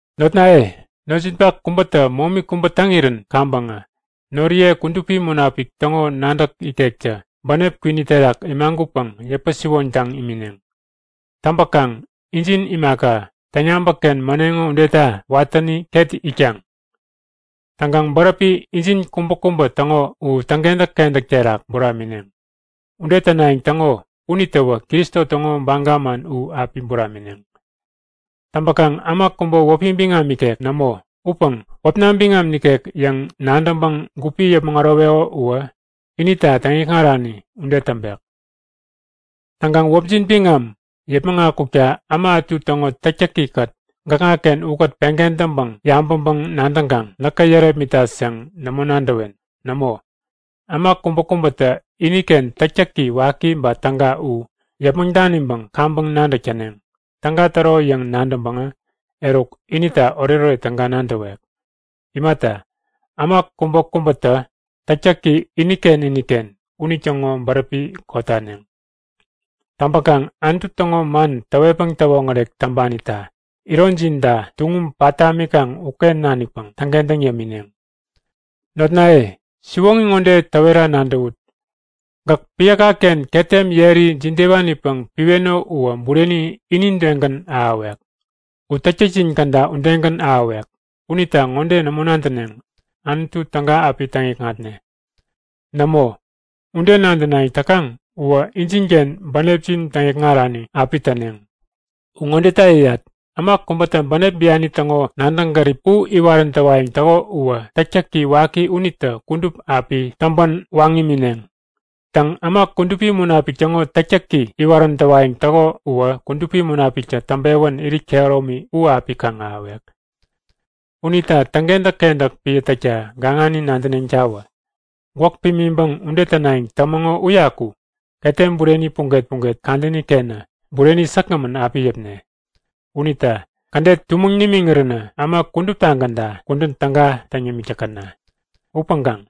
Notnaye, notjinpak kubätä momi kubä täŋirän kaŋpäŋä noriye Kudupi Munapik täŋo nadäk ikektä bänep kwini terak imagutpäŋ yäpä-siwoŋtaŋ imineŋ. Täŋpäkaŋ injin imaka täŋyabäk-ken mäneŋo udeta watäni ket itkaŋ. Täŋkaŋ bäräpi injin kubäkubä täŋo u täŋkentäk-kentäk terak buramineŋ. Ude tänayäŋ täŋo unitäwä Kristo täŋo baga man u api buramineŋ. Täŋpäkaŋ äma kubä wäpi biŋam ikek nämo upäŋ wäpna biŋam nikek yäŋ nadäŋpäŋ gupi yäpmäŋ äroweko uwä inita täŋikŋarani ude täŋpek. Täŋkaŋ wäpjin biŋam yäpmäŋ akukta äma ätu täŋo täktäki-kät gäkŋaken ukät peŋ kentäŋpäŋ yabäŋpäŋ-nadäŋkaŋ näkä yärepmitat yäŋ nämo nadäwen. Nämo, äma kubäkubätä iniken täktäki waki ba täga u yäpmäŋ daniŋpäŋ kaŋpäŋ nadäk täneŋ. Täga täro yäŋ nadäŋpäŋä eruk inita oretoret täga nadäwek. Imata, äma kubäkubätä täktäki iniken iniken unitäŋo bäräpi kotaneŋ. Täŋpäkaŋ Anutu täŋo man täwetpäŋ täwoŋärek täŋpanita ironjinta tuŋum pat tamikaŋ uken nanikpäŋ täŋkentäŋ yämineŋ. Notnaye, siwoŋi ŋode täwera nadäwut; Gäk piäka-ken ketem yeri jidewanipäŋ piweno uwä bureni inidegän ahäwek. U täktäkjin käda udegän ahäwek. Unita ŋode nämo nadäneŋ; Anutu täga api täŋikŋatne. Nämo, ude nadänayäŋ täkaŋ uwä injinken bänepjin täŋikŋarani api täneŋ. U ŋodeta yäyat; Äma kubätä bänep bianini täŋo nadäŋ gärip u iwarän täwayäŋ täko uwä täktäki waki unitä kudup api täŋpänwaŋ imineŋ. Täŋ, äma Kudupi Munapik täŋo täktäki iwarän täwayäŋ täko uwä Kudupi Munapiktä täŋpewän irit kehäromi u api kaŋ-ahäwek. Unita täŋkentäk-kentäk piä täkta gaŋani nadänetawä! Gwäk pimiŋpäŋ ude tänayäŋ tämäŋo uyaku ketem bureni puget-puget kadäni-kenä bureni säkgämän api yäpne. Unita kädet tumäŋ nimiŋiränä äma kuduptagänta kudän täga täŋ yämik täkäna! Upäŋkaŋ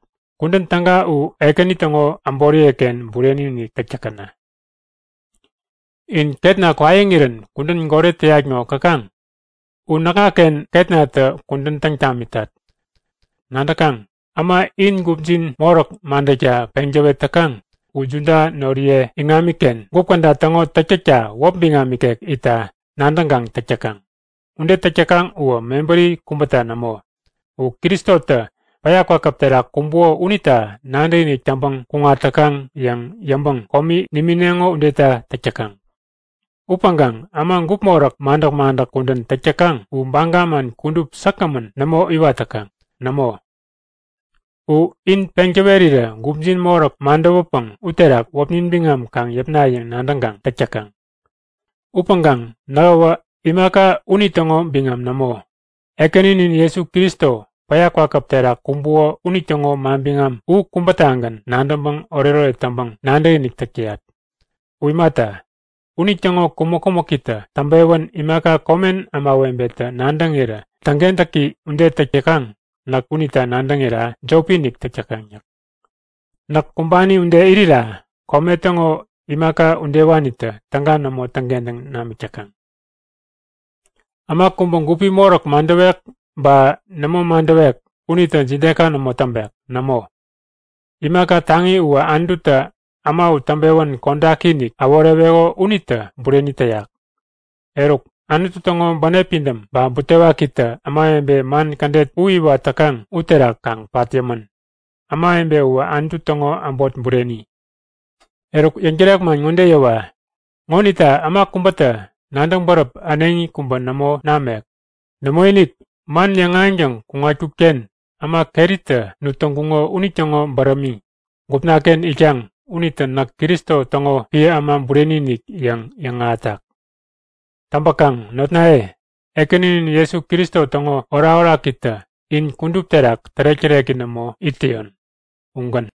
kudän täga u Ekäni täŋo äboriye-ken bureni-inik täk täkäna! In ketna kwaiŋirän kudän goret täyat ŋo käkaŋ? U näkŋaken ketnatä kudän täŋ tamitat. Nadäkaŋ? Äma in gupjin moräk madäkta peŋ täwet täkaŋ u Juda noriye iŋamiken gup käda täŋo täktäkta wäp biŋam ikek itta nadäŋkaŋ täk täkaŋ. Ude täk täkaŋ uwä mebäri kubäta nämo, u Kristotä päya kwakäp terak kumbuko unita nadäkinik täŋpäŋ kuŋat täkaŋ yäŋ yäŋpäŋ komi nimineŋo udeta täk täkaŋ. Upäŋkaŋ äma gup moräk madäk-madäk kudän täk täkaŋ u baga man kudup säkgämän nämo iwat täkaŋ. Nämo, u in peŋ täwerirä gupjin moräk madäwäpäŋ uterak wäpnin biŋam kaŋ yäpna yäŋ nadäŋkaŋ täk täkaŋ. Upäŋkaŋ nähäwä imaka unitäŋo biŋam nämo, Ekäninin Jesu Kristo päya kwakäp terak kumbuko unitäŋo manbiŋam u kubätagän nadäŋpäŋ oretoret täŋpäŋ nadäkinik täk täyat. U imata, unitäŋo kumäk-kumäkitä täŋpewän imaka komen ämawebetä nadäŋirä täŋkentäki ude täk täkaŋ, näk unita nadäŋira jopi-inik täk täkaŋ. Näk kumbani ude irira kome täŋo imaka udewanitä täga nämo täŋkentäŋ namik täkaŋ. Äma kubä gupi moräk madäwek ba nämo madäwek unitä jideka nämo täŋpek. Nämo, imaka taŋi uwä Anututä äma u täŋpewän kodaki-inik äworeweko unitä bureni täyak. Eruk, Anutu täŋo bänep pidäm ba butewakitä ämawebe man kädet u iwat täkaŋ uterak kaŋ pat yämän. Ämawebe uwä Anutu täŋo äbot bureni. Eruk yäŋtärek man ŋode yäwa; Ŋonita äma kubätä nadäŋ bäräp äneŋi kubä nämo namek. Nämoinik, man yäŋahäŋtäŋ kuŋatkut-ken äma keritä nut täŋkuŋo unitäŋo bärämi gupna-ken itkaŋ unitä näk Jesu Kristo täŋo piä äma bureni-inik yäŋ yäŋahätak. Täŋpäkaŋ notnaye, Ekäninin Jesu Kristo täŋo orakorakitä in kudup terak tärek-täreki nämo it täyon. Ugän.